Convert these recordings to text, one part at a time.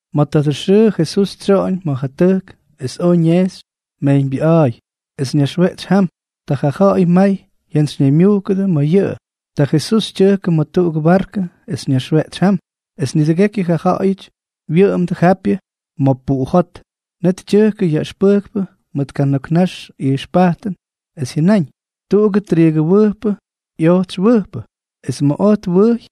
Ma̱ tadʉ xʉʉ Jesús tsyoꞌoñ ma̱ ja tʉjk es oj ñejxy mejyñbyʉꞌa̱a̱y, es ñaxweꞌtsy jam. Ta ja ja̱ꞌa̱y may jyantsyñaymyujkʉ ma̱ yʉꞌʉ. Ta Jesús tyʉjkʉ ma̱ tuꞌugʉ barkʉ es ñaxweꞌtsy jam, es nidʉgekyʉ ja ja̱ꞌa̱yʉty wyʉꞌʉmdʉ japyʉ ma̱ puꞌu jot. Net tyʉjkʉ yaꞌʉxpʉjkpʉ mʉt kana̱k nax ijxpajtʉn, es jyʉnáñ: —Tuꞌugʉ triigʉwʉjpʉ ꞌyojtsy wʉjpʉ. Es ma̱ oj twʉjy,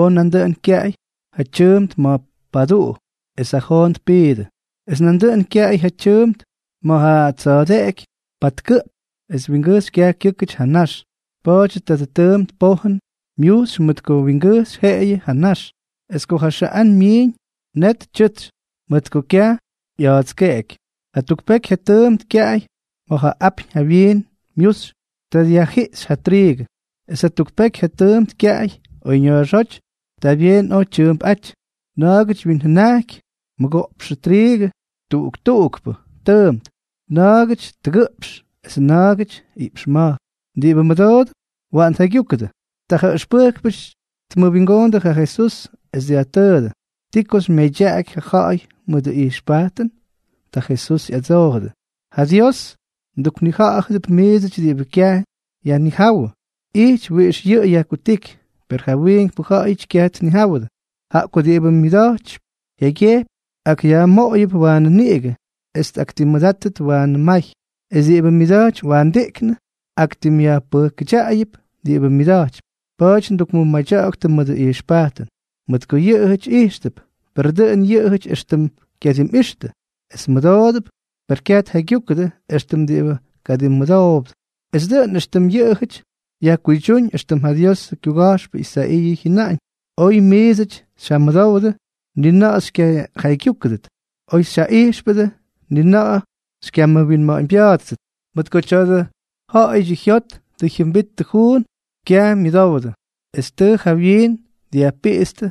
oj nandʉꞌʉn kyaꞌay ja tyʉʉmt ma̱ paduꞌu, es ja joon tpiidʉ. Es nandʉꞌʉn kyaꞌay ja tyʉʉmt ma̱ ja tsa̱a̱deꞌeky patkʉꞌp es wingʉjxy kyaj kyʉ́kʉty ja nax. Pa̱a̱dyʉ tadʉ tʉʉmt pojʉn myujxy mʉt ko wingʉjxy jeꞌeyʉ ja nax. Es ko ja xʉꞌán myiiñ, net tyʉtsy, mʉt ko kyaj ꞌya̱a̱tskeꞌeky. Jatuk peky ja tʉʉmt kyaꞌay ma̱ ja apyñ jawyiin myujxy, ta dyajjiꞌxy ja triigʉ. Es jatuk peky ja tʉʉmt kyaꞌay oyña̱a̱xóty. Ta byeen oy tyʉʉmpꞌa̱jty. Na̱a̱gʉty wyinjʉnajky mʉgoꞌpxʉ triigʉ tuꞌuk tuꞌukpʉ tʉʉmt, na̱a̱gʉty tʉgʉꞌpx es na̱a̱gʉty iꞌpx ma̱jk. Diꞌibʉ mʉdoodʉp, waꞌan tjaygyúkʉdʉ. Ta ja ʉxpʉjkpʉty tmʉwingoondʉ ja Jesús, es dyajtʉʉdʉ: —¿Ti ko xymyʉmadyaꞌaky ja ja̱ꞌa̱y mʉdʉ ijxpajtʉn? Ta Jesús ꞌyadsoojʉdʉ: —Ja Dios mduknija̱ꞌa̱dʉp miidsʉty diꞌibʉ kyaj yajnijáwʉ ijty wiꞌix yʉꞌʉ yajkutíky, per ja wiinkpʉ ja̱ꞌa̱yʉty kyaj tnijáwʉdʉ. Jaꞌa ko diꞌibʉ myʉda̱jty jyaygyejpy, akꞌyajmoꞌoyʉp waanʉ niꞌigʉ; es tꞌaktimmʉdátʉt waanʉ may; es diꞌibʉ myʉda̱jtypy waandiꞌknʉ, aktimꞌyajpʉjkʉdyaꞌayʉp diꞌibʉ myʉda̱jtypy. Pa̱a̱ty ndukmʉmadya̱ꞌa̱ktʉ mʉdʉ ijxpajtʉn, mʉt ko yʉꞌʉjʉty ijxtʉp, per dʉꞌʉn yʉꞌʉjʉty éxtʉm kyadimꞌixtʉ; es mʉdoodʉp, per kyaj tjaygyúkʉdʉ éxtʉm tkadimmʉdowdʉ. Es dʉꞌʉn éxtʉm yʉꞌʉjʉty yajkuydyúñ éxtʉm ja Diosʉ kyuga̱jxpʉ Isaiiʉ jyʉnáñ: Oy miidsʉty xyjamʉdowdʉ, ni na̱ꞌa̱ xykyajaygyúkʉdʉt; oy xyjaꞌijxpʉdʉ, ni na̱ꞌa̱ xykyamʉwinma̱ꞌa̱ñbya̱a̱ttʉt, mʉt ko tya̱dʉ ja̱ꞌa̱yʉdyʉ jyot tʉ jyʉmbittʉ juun, kyaj myʉdowdʉ es tʉ ja wyiin dyajpiꞌitstʉ,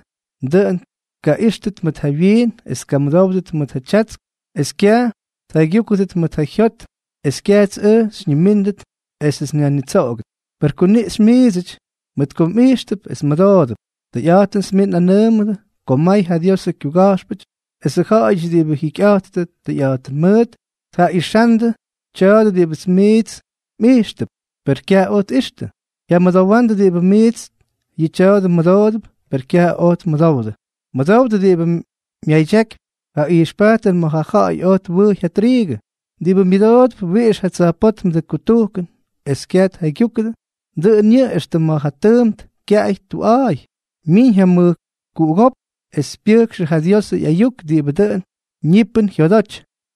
dʉꞌʉn tkaꞌíxtʉt mʉt ja wyiin es tkamʉdówʉt mʉt ja tyatsk, es kyaj tjaygyúkʉdʉt mʉt ja jyot, es kyajts ʉj xyñimíndʉt esʉts nyajnitsoꞌogʉt. ’Per kuniꞌxy miidsʉty, mʉt ko mꞌijxtʉp es mmʉdoodʉp. Tʉyꞌa̱jtʉnʉts miits nꞌanʉʉmʉdʉ ko may ja Diosʉ kyuga̱jxpʉty esʉ ja̱ꞌa̱yʉty diꞌibʉ jikyꞌa̱jttʉ tʉyꞌa̱jtʉn mʉʉt tjaꞌixandʉ tya̱a̱dʉ diꞌibʉ miits mꞌijxtʉp, per kyaj oj tꞌixtʉ; jyamʉdowandʉ diꞌibʉ miits yʉ tya̱a̱dʉ mmʉdoodʉp, per kyaj oj tmʉdowdʉ. ’Mʉdowdʉ diꞌibʉ myadyakypy ja ijxpajtʉn ma̱ ja ja̱ꞌa̱y oj twʉjy ja triigʉ. Diꞌibʉ myʉdoodʉp wiꞌix ja tsa̱jpótmʉdʉ kutujkʉn es kyaj tjaygyúkʉdʉ, dʉꞌʉn yʉꞌʉ éxtʉm ma̱ ja tʉʉmt kyaꞌay tuꞌa̱a̱y. Myiiñ ja mʉjkuꞌugópk es pyʉjkxʉ ja Diosʉ ꞌyayuk diꞌibʉ dʉꞌʉn niꞌipyʉn jyodoty.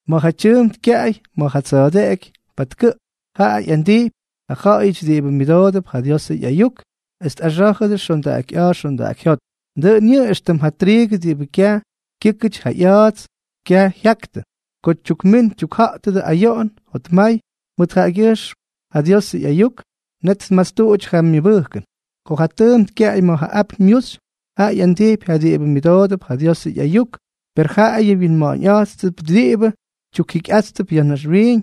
Ma̱ ja tʉʉmt kyaꞌay ma̱ ja tsa̱a̱deꞌeky patkʉꞌp, jaꞌa ꞌyandijpy ja ja̱ꞌa̱yʉty diꞌibʉ myʉdoodʉp ja Diosʉ ꞌyayuk es tꞌaxá̱jʉdʉ xondaꞌaky ꞌya̱a̱ xondaꞌaky jyot. Dʉꞌʉn yʉꞌʉ éxtʉm ja triigʉ diꞌibʉ kyaj kyʉ́kʉty ja ꞌya̱a̱ts, kyaj jyaktʉ. Ko tyukmín tyukja̱ꞌtʉdʉ ayoꞌon jotmay mʉt jaꞌagyʉjxm ja Diosʉ ꞌyayuk, net tmastuꞌuty ja myʉbʉjkʉn. Ma̱ ja tʉʉmt kyaꞌay ma̱ ja apyñ myuxy, jaꞌa ꞌyandijpy ja diꞌibʉ myʉdoodʉp ja Diosʉ ꞌyayuk; per jaꞌayʉ wyinma̱ꞌa̱ñꞌa̱jttʉp diꞌibʉ tyukjikyꞌáttʉp ya̱ naxwiiñ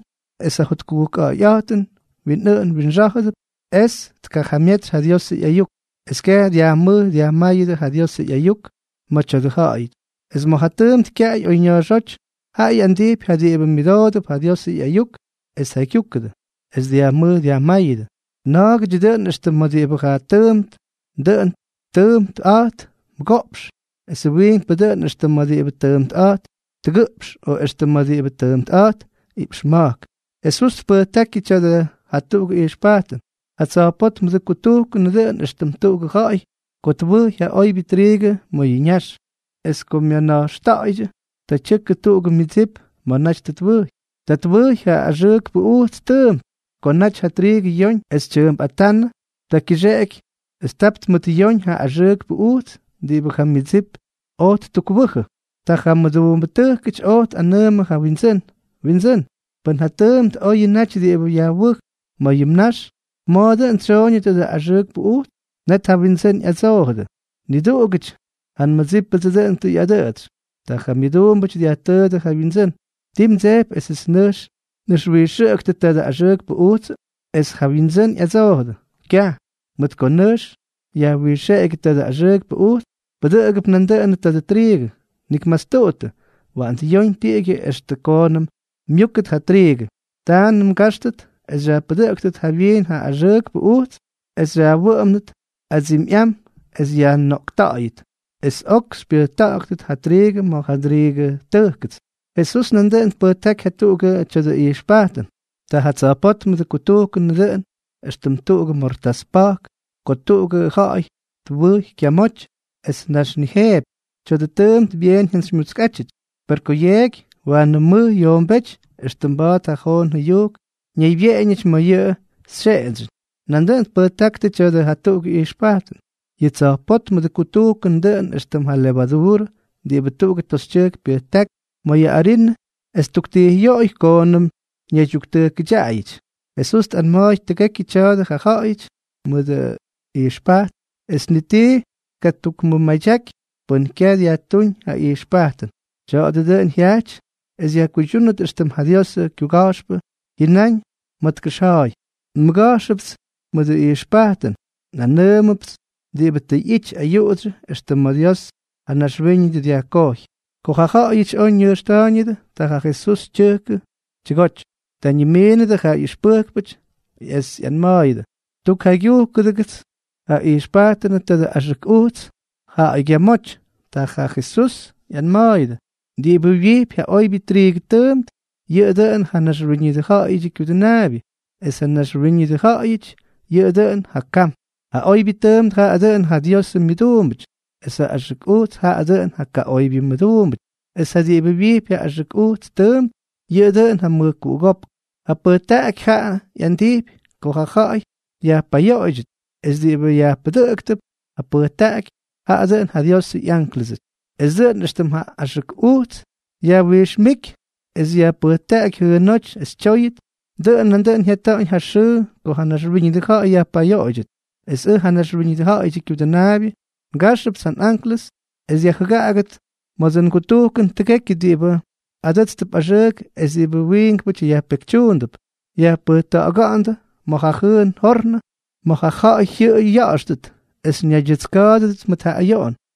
es ja jotkujkja̱ꞌa̱yꞌa̱jtʉn winꞌʉꞌʉn winxá̱jʉdʉp, es tkajamyetsy Diosʉ ꞌyayuk, es kyaj dyajmʉj dyajmáyʉdʉ ja Diosʉ ꞌyayuk ma̱ tya̱dʉ ja̱ꞌa̱yʉty. Es ma̱ ja tʉʉmt kyaꞌay oyña̱a̱xóty, jaꞌa ꞌyandijpy ja diꞌibʉ myʉdoodʉp ja Diosʉ ꞌyayuk es tjaygyúkʉdʉ, es dyajmʉj dyajmáyʉdʉ. Na̱a̱gʉdyʉ dʉꞌʉn éxtʉm ma̱ diꞌibʉ ja tʉʉmt dʉꞌʉn tʉʉmpꞌa̱jt mʉgoꞌpx, esʉ wiinkpʉ dʉꞌʉn éxtʉm ma̱ diꞌibʉ tʉʉmpꞌa̱jt tʉgʉꞌpx, o éxtʉm ma̱ diꞌibʉ tʉʉmpꞌa̱jt iꞌpx ma̱jk. Jesús tpʉjtákyʉ tya̱dʉ jatuꞌugʉ ijxpajtʉn: —Ja tsa̱jpótmʉdʉ kutujkʉnʉ dʉꞌʉn éxtʉm tuꞌugʉ ja̱ꞌa̱y ko twʉjy ja oybyʉ triigʉ ma̱ yʉ ñax. Es ko myana̱jxta̱ꞌa̱ydyʉ, ta tyʉkʉ tuꞌugʉ myʉdsip ma̱ naty tʉ twʉjy. Ta twʉjy ja axʉʉkpʉ ujts tʉʉmt. Ko naty ja triigʉ yoñ es tyʉʉmpꞌatánʉ, ta kyʉxeꞌky es tap tmʉtꞌyóñ ja axʉʉkpʉ ujts diꞌibʉ ja myʉdsip oj ttukwʉjʉ. Ta ja mʉduumbʉtʉjkʉty oj tꞌanʉʉmʉ ja wyindsʉ́n: “Windsʉ́n, pʉn ja tʉʉmt oyʉ naty diꞌibʉ yajwʉj ma̱ yʉ mnax, ¿ma̱a̱ dʉn tsyooñʉ tadʉ axʉʉkpʉ ujts?” Net ja wyindsʉ́n ꞌyadsoojʉdʉ: “Niduꞌugʉty ja nmʉdsípʉdsʉ dʉꞌʉn tʉ ꞌyadʉꞌʉtsy.” Ta ja myʉduumbʉty dyajtʉʉdʉ ja wyindsʉ́n: “¿Ti mdsejpy esʉts nʉjx nꞌʉxwijxʉꞌʉktʉ tadʉ axʉʉkpʉ ujtsʉ?” Es ja wyindsʉ́n ꞌyadsoojʉdʉ: “Kyaj, mʉt ko nʉjx yajwijxeꞌegyʉ tadʉ axʉʉkpʉ ujts, pʉdʉꞌʉgʉp nandʉꞌʉn tadʉ triigʉ. Nik mastuꞌuttʉ. Waꞌan dyoñ tiꞌigyʉ extʉ koonʉm myúkʉt ja triigʉ. Taanʉm ngáxtʉt es xyajpʉdʉꞌʉktʉt jawyiin ja axʉʉkpʉ ujts es xyꞌawʉʉndʉt adsimyꞌam es yajnoꞌkta̱ꞌa̱yʉt. Es ok xypyʉjkʉꞌʉktʉt ja triigʉ ma̱ ja ndriigʉ tʉjkʉts.” Jesús nandʉꞌʉn tpʉjtáky jatuꞌugʉ tya̱dʉ ijxpajtʉn: —Ja tsa̱jpótmʉdʉ kutujkʉn dʉꞌʉn éxtʉm tuꞌugʉ mortás pa̱jk ko tuꞌugʉ ja̱ꞌa̱y twʉjy kyamoty es tnaxnijeepy. Tya̱dʉ tʉʉmt byeen jyantsymyutskꞌátyʉty; per ko yeeky, waanʉ mʉj yoombéty éxtʉm mba̱a̱t ja joon jʉyujk ñaybyeꞌeñʉty ma̱ yʉ xyeꞌendsyʉn. Nandʉꞌʉn tpʉjtákyʉ tya̱dʉ jatuꞌugʉ ijxpajtʉn: —Yʉ tsa̱jpótmʉdʉ kutujkʉn dʉꞌʉn éxtʉm ja levaduurʉ diꞌibʉ tuꞌugʉ toxytyʉjk pyʉjtákypy ma̱ mayʉ arinʉ es ttuktijꞌyoꞌoy koonʉm ñaydyuktʉjkʉdyaꞌayʉty. Jesús tꞌanma̱a̱y tʉgekyʉ tya̱a̱dʉ ja ja̱ꞌa̱yʉty mʉdʉ ijxpajt, es ni tii tkatukmʉmadyaky pʉn kyaj dyajtúñ ja ijxpajtʉn. Tya̱a̱dʉ dʉꞌʉn jyajty es yajkuydyúnʉt éxtʉm ja Diosʉ kyuga̱jxpʉ jyʉnáñ ma̱ tkʉxja̱a̱y: Nmʉga̱jxʉpts mʉdʉ ijxpajtʉn, nꞌanʉʉmʉpts diꞌibʉ tʉ ꞌyity ayuꞌudsyʉ extʉ ma̱ Dios ja naxwíñʉdʉ dyajkojy. Ko ja ja̱ꞌa̱yʉty oj ñʉjxta̱a̱yñʉdʉ, ta ja Jesús tyʉjkʉ tyʉgoty. Ta ñimiinʉdʉ ja ꞌyʉxpʉjkpʉty es ꞌyanma̱a̱yʉdʉ: —Tukjaygyujkʉdʉgʉts ja ꞌyijxpajtʉnʉ tadʉ axʉk ujts ja̱ꞌa̱ygyamóty. Ta ja Jesús ꞌyanma̱a̱yʉdʉ: —Diꞌibʉ wyijpy ja oybyʉ triigʉ tʉʉmt, yʉꞌʉ dʉꞌʉn ja Naxwíñʉdʉ Ja̱ꞌa̱yʉdyʉ Kyudʉnaabyʉ, es ja naxwíñʉdʉ ja̱ꞌa̱yʉty yʉꞌʉ dʉꞌʉn ja kam. Ja oybyʉ tʉʉmt jaꞌa dʉꞌʉn ja Diosʉ myʉduumbʉty, es ja axʉk ujts jaꞌa dʉꞌʉn ja kaꞌoybyʉ myʉduumbʉty, es ja diꞌibʉ wyijpy ja axʉk ujts tʉʉmt, yʉꞌʉ dʉꞌʉn ja mʉjkuꞌugópk. Ja pʉjtaꞌaky jaꞌa ꞌyandijpy ko ja̱ꞌa̱y yajpayoꞌoydyʉt, es diꞌibʉ yajpʉdʉꞌktʉp ja pʉjtaꞌaky, jaꞌa dʉꞌʉn ja Diosʉ ꞌyánklʉsʉty. Es dʉꞌʉn éxtʉm ja axʉk ujts yajwijxmíky es yajpʉjtaꞌaky jʉʉnóty es tyóyʉt, dʉꞌʉn nandʉꞌʉn jyata̱ꞌa̱ñ ja xʉʉ ko ja naxwíñʉdʉ ja̱ꞌa̱y yajpayoꞌoydyʉt. Es ʉj ja Naxwíñʉdʉ Ja̱ꞌa̱yʉdyʉ Kyudʉnaabyʉ, ngajxʉpts ja nꞌánklʉsʉts es dyajjʉgaꞌaktʉt ma̱dsʉ ngutujkʉn tʉgekyʉ diꞌibʉ adʉ́tstʉp axʉʉk es diꞌibʉ wiinkpʉty yajpekytyuundʉp. Yajpʉjta̱ꞌa̱ga̱ꞌa̱ndʉ ma̱ ja jʉʉn jornʉ ma̱ ja̱ꞌa̱y jyʉꞌʉy ya̱ꞌa̱xtʉt es ñaydyʉtska̱a̱dʉdʉt mʉt ja ayoꞌon.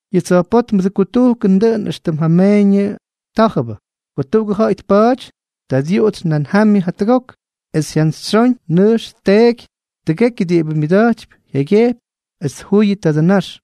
’Yʉ tsa̱jpótmʉdʉ kutujkʉn dʉꞌʉn éxtʉm ja meeñʉ tá̱jʉbʉ. Ko tuꞌugʉ ja̱ꞌa̱y tpa̱a̱ty, ta dyuꞌutsy nan jamyʉ jatʉgok, es jyantsyxyón nʉjx tteeky tʉgekyʉ diꞌibʉ myʉda̱jty jyaygyejpy, es tjuyʉ tadʉ nax.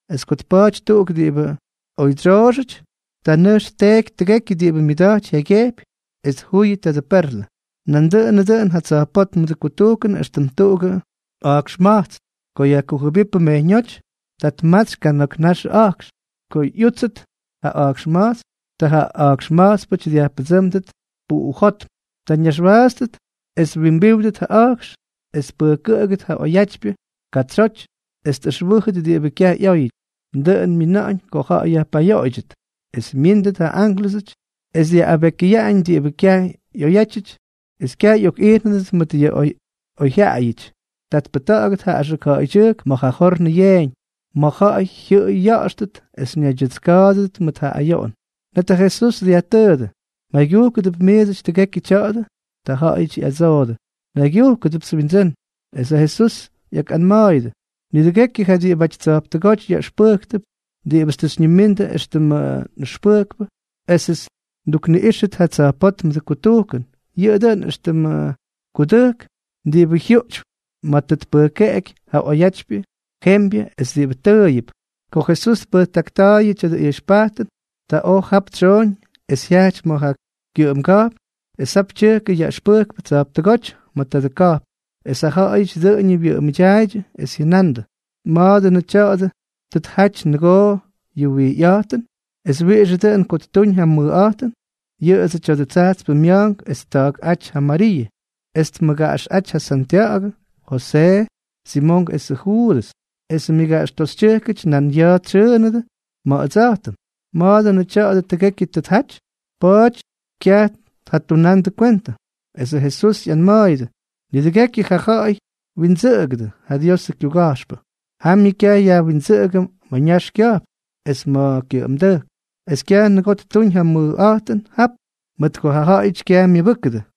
es ko tpa̱a̱ty tuꞌuk diꞌibʉ oydsyooxʉty, ta nʉjx tteeky tʉgekyʉ diꞌibʉ myʉda̱jty jyaygyejpy, es tjuyʉ tadʉ perlʉ. ’Nandʉꞌʉnʉ dʉꞌʉn ja tsa̱jpótmʉdʉ kutujkʉn éxtʉm tuꞌugʉ a̱jkxma̱jtsn. Ko yajkujʉbípʉ mejyñóty, ta tmatsy kana̱k naxʉ a̱jkx. Ko ꞌyútsʉt ja a̱jkxma̱jtsn, ta ja a̱jkxma̱jtspʉty dyajpʉdsʉ́mdʉt puꞌujótm. Ta ñaxwaatstʉt es twimbíwdʉt ja a̱jkx, es tpʉjkʉꞌʉgʉt ja oyatypyʉ katsyoty es tꞌʉxwʉ́jʉt diꞌibʉ kyaj ꞌyóyʉty. Dʉꞌʉn myina̱ꞌa̱ñ ko ja̱ꞌa̱y yajpayoꞌoydyʉt. Es myíndʉt ja ánklʉsʉty es dyaꞌꞌabekyʉyaꞌañ diꞌibʉ kyaj ꞌyoyjyaꞌayʉty, es kyaj ꞌyokꞌijnʉdʉt mʉt ja oyjyaꞌayʉty. Ta tpʉjta̱ꞌa̱gʉt ja axʉk ja̱ꞌa̱ydyʉjk ma̱ ja jornʉ yeeñ, ma̱ ja̱ꞌa̱y jyʉꞌʉy ya̱ꞌa̱xtʉt es ñaydyʉtska̱a̱dʉdʉt mʉt ja ayoꞌon. Net ja Jesús dyajtʉʉdʉ: —¿Mjaygyujkʉdʉp miidsʉty tʉgekyʉ tya̱a̱dʉ? Ta jaꞌajʉty ꞌyadsoodʉ: —Njaygyujkʉdʉpts Windsʉ́n. Es ja Jesús ꞌyakꞌanma̱a̱yʉdʉ: —Nidʉgekyʉ ja diꞌibʉty tsa̱jptʉgóty yaꞌʉxpʉjktʉp diꞌibʉts tʉ xyñimindʉ éxtʉmdsʉ nꞌʉxpʉjkpʉ esʉts ndukniꞌíxʉt ja tsa̱jpótmʉdʉ kutujkʉn, yʉꞌʉ dʉꞌʉn éxtʉmʉ kudʉjk diꞌibʉ jyuꞌtypy ma̱ tʉ tpʉjkeꞌeky ja oyatypyʉ jembyʉ esʉ diꞌibʉ tʉʉyʉp. Ko Jesús tpʉjtakta̱a̱yʉ tya̱dʉ ijxpajtʉn, ta oj jap tsyooñ es jyajty ma̱ ja kyʉꞌʉmga̱jpn, es jap tyʉjkʉ yaꞌʉxpʉjkpʉ tsa̱jptʉgóty ma̱ tadʉ ka̱jpn. Es ja ja̱ꞌa̱yʉty dʉꞌʉñʉ wyʉꞌʉmʉdyaaydyʉ, es jyʉna̱ꞌa̱ndʉ: —¿Ma̱a̱ dʉnʉ tya̱a̱dʉ tʉ tjaty nʉgoo yʉ wijyꞌa̱jtʉn, es wiꞌixʉ dʉꞌʉn ko ttuñ ja mʉjꞌa̱jtʉn? Yʉꞌʉdsʉ tya̱dʉ tsajtspʉ mya̱a̱nk es tta̱a̱kꞌáty ja Mariiʉ, es tmʉgaꞌaxꞌáty ja Santya̱ꞌa̱gʉ, Josee, Simonk esʉ Juudʉs, esʉ myʉgaꞌaxtoxytyʉjkʉty nan ya̱a̱ tsyʉʉnʉdʉ ma̱ ʉdsa̱jtʉm. ¿Ma̱a̱ dʉnʉ tya̱a̱dʉ tʉgekyʉ tʉ tjaty? Pa̱a̱ty kyaj tjatunandʉ kwentʉ. Esʉ Jesús ꞌyanma̱a̱yʉdʉ: —Nidʉgekyʉ ja ja̱ꞌa̱y twindsʉꞌʉgʉdʉ ja Diosʉ kyuga̱jxpʉ, jamyʉ kyaj yajwindsʉꞌʉgʉ ma̱ ñax kya̱jpn es ma̱ kyʉꞌʉmdʉjk. Es kyaj nʉgoo ttuuñ ja mʉjꞌa̱jtʉn jap, mʉt ko ja ja̱ꞌa̱yʉty kyaj myʉbʉjkʉdʉ.